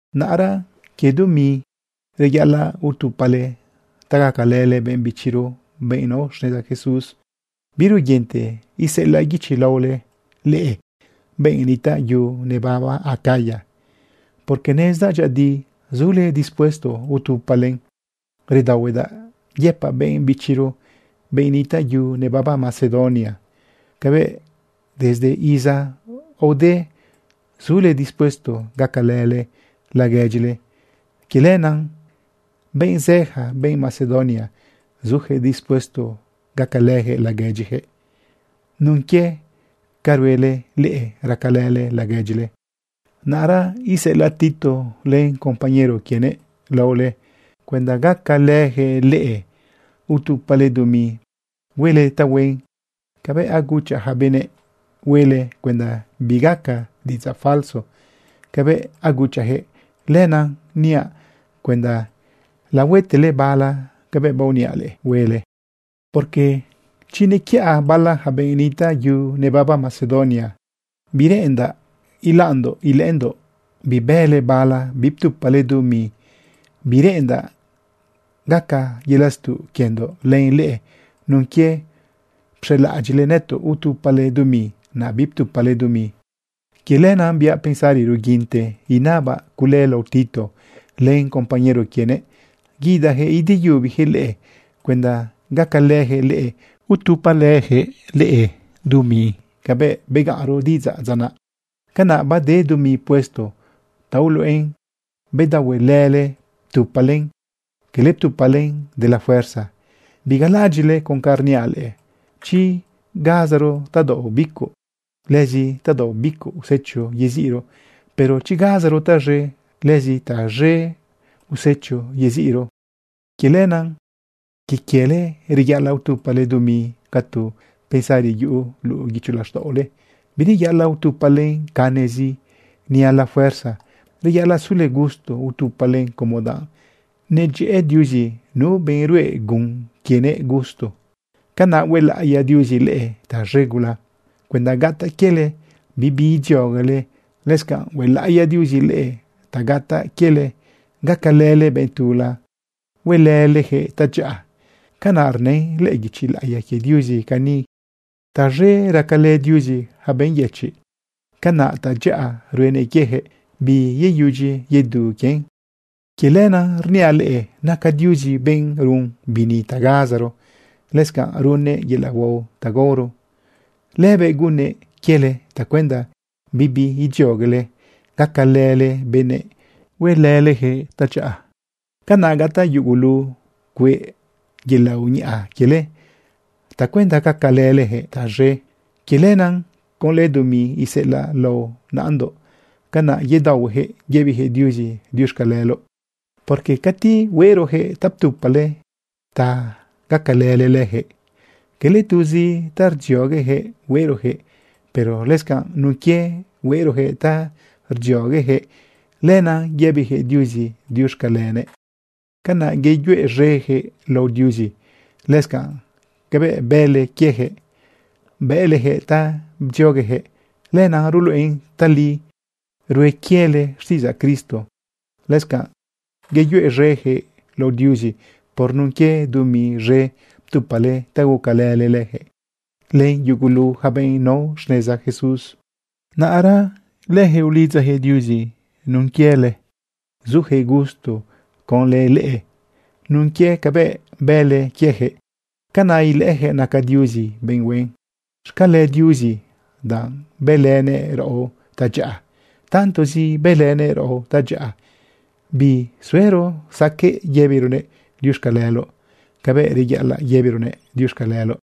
Naꞌra quie dumi reyaꞌalaꞌ utupale ta gacalële benꞌ bichiro, benꞌ nao xneza Jesús, biruguinte iseꞌelaꞌ guichi laole leꞌe, benꞌ nitaꞌ yu nebaba Acaya, porque nezdaꞌ dyëꞌëdi zule dispuesto utupalen. Redaohuedaꞌ yëpaꞌ benꞌ bichiro, benꞌ nitaꞌ yu nebaba Macedonia, cabëꞌ desde iza aode zule dispuesto gacalële laguedyile. Quie lenaꞌ, benꞌ zëja, benꞌ Macedonia, zujëꞌ dispuesto gacalëjëꞌ laguedyijëꞌ nun quie ca ruele leꞌe racalële laguedyile. Naꞌra iseꞌelaꞌ Tito len compañero quienëꞌ laole cuenda gacalëjëꞌ leꞌe utupale dumi huele tahuen cabëꞌ aguchaꞌ ja benëꞌ huele cuenda bigaca diꞌidzaꞌ falso cabëꞌ aguchaꞌjëꞌ. Lenaꞌ niaꞌ cuenda lahuetele bala cabëꞌ baoniaꞌ leꞌe huele. Porque chi nequiꞌa bala ja benꞌ nitaꞌ yu nebaba Macedonia, bireꞌendaꞌ ilaꞌndoꞌ ilëꞌëndoꞌ bibële bala biptupale dumi. Bireꞌendaꞌ gaca yelaꞌ stuꞌ quiendoꞌ len leꞌe nun quie pxelaꞌadyiꞌle nëtoꞌ utupale dumi, naꞌ biptupale dumi. Quie lenaꞌ biaꞌ pensari ruguinte inabaꞌ cule lao Tito len compañero quienëꞌ guidajëꞌ ideyubijëꞌ leꞌe cuenda gacalëjëꞌ leꞌe utupalëjëꞌ leꞌe dumi cabëꞌ begaꞌnro diꞌidzaꞌ dza naꞌ. Canaꞌ bade dumi puesto ta uluꞌen bedaohuele ptupalen, quele ptupalen de la fuerza. Bigalaꞌadyiꞌle con ca rniaꞌ leꞌe: Chi gazaro tadaoꞌ bicuꞌ, lëzi tadaoꞌ bicuꞌ usecho yeziꞌro. Pero chi gazaro taz̃e, lëzi taz̃e usecho yeziꞌro. Quie lenaꞌ quie quiele reyaꞌalaꞌ utupale dumi ca tu pensari yuꞌu luꞌu guicho laxtaꞌole. Bireyaꞌalaꞌ utupalen canezi ni a la fuerza. Reyaꞌalaꞌ sule gusto utupalen, como danꞌ nedyëꞌë Diuzi nu benꞌ ruꞌe gun quienëꞌ gusto. Canaꞌ huelaꞌiya Diuzi leꞌe taz̃e gula cuenda gataꞌ quiele, bibi idzioguele. Lëscanꞌ huelaꞌiya Diuzi leꞌe ta gataꞌ quiele gacalële benꞌ tula huelëlejëꞌ tadyaꞌa. Canaꞌ rnën lëꞌë guichi laꞌiya quie Diuzi cani: Taz̃e racalë Diuzi ja benꞌ yëchiꞌ. Ca naca tadyaꞌa ruenëꞌ quiejëꞌ, biyeyudyi yedu quien. Quie lenaꞌ rniaꞌ leꞌe, naca Diuzi benꞌ run bini ta gazaro, lëscanꞌ runnëꞌ yelaꞌ huao ta gaoro. Lëbëꞌ gunnëꞌ quiele tacuenda bibi idzioguele gacalële benëꞌ huelëlejëꞌ tadyaꞌa. Canaꞌ gataꞌ yugulu cueꞌ yelaꞌ uñaꞌa quiele tacuenda gacalëlejëꞌ taz̃e. Quie lenaꞌ conlë dumi iseꞌelaꞌle lao naꞌandoꞌ, canaꞌ yedaohuejëꞌ yëbijëꞌ Diuzi diuxcaleloꞌ. Porque cati hueꞌrojëꞌ ta ptupale ta gacalële lëjëꞌ, cala tuzi ta rdzioguejëꞌ hueꞌrojëꞌ, pero lëscanꞌ nun quie hueꞌrojëꞌ ta rdzioguejëꞌ, lenaꞌ yëbijëꞌ Diuzi diuxcalenëꞌ. Canaꞌ yeyuez̃ejëꞌ lao Diuzi. Lëscanꞌ cabëꞌ bële quiejëꞌ, bëꞌlejëꞌ ta bdzioguejëꞌ, lenaꞌ ruluꞌen tali rue quiele xtiꞌidzaꞌ Cristo. Lëscanꞌ yeyuez̃ejëꞌ lao Diuzi por nun quie dumi z̃e ptupale ta gucalële lëjëꞌ len yugu ja benꞌ nao xneza Jesús. Naꞌra lëjëꞌ ulidzajëꞌ Diuzi nun quiele. Zujëꞌ gusto conlë leꞌe nun quie cabëꞌ bële quiejëꞌ, canaꞌ ilëꞌëjëꞌ naca Diuzi benꞌ huen. Xcale Diuzi danꞌ bëlënëꞌ raꞌo tadyaꞌa. Tantozi bëlënëꞌ raꞌo tadyaꞌa, bisuero saqueꞌ yëbironëꞌ diuxcaleloꞌ cabëꞌ reyaꞌalaꞌ yëbironëꞌ diuxcaleloꞌ.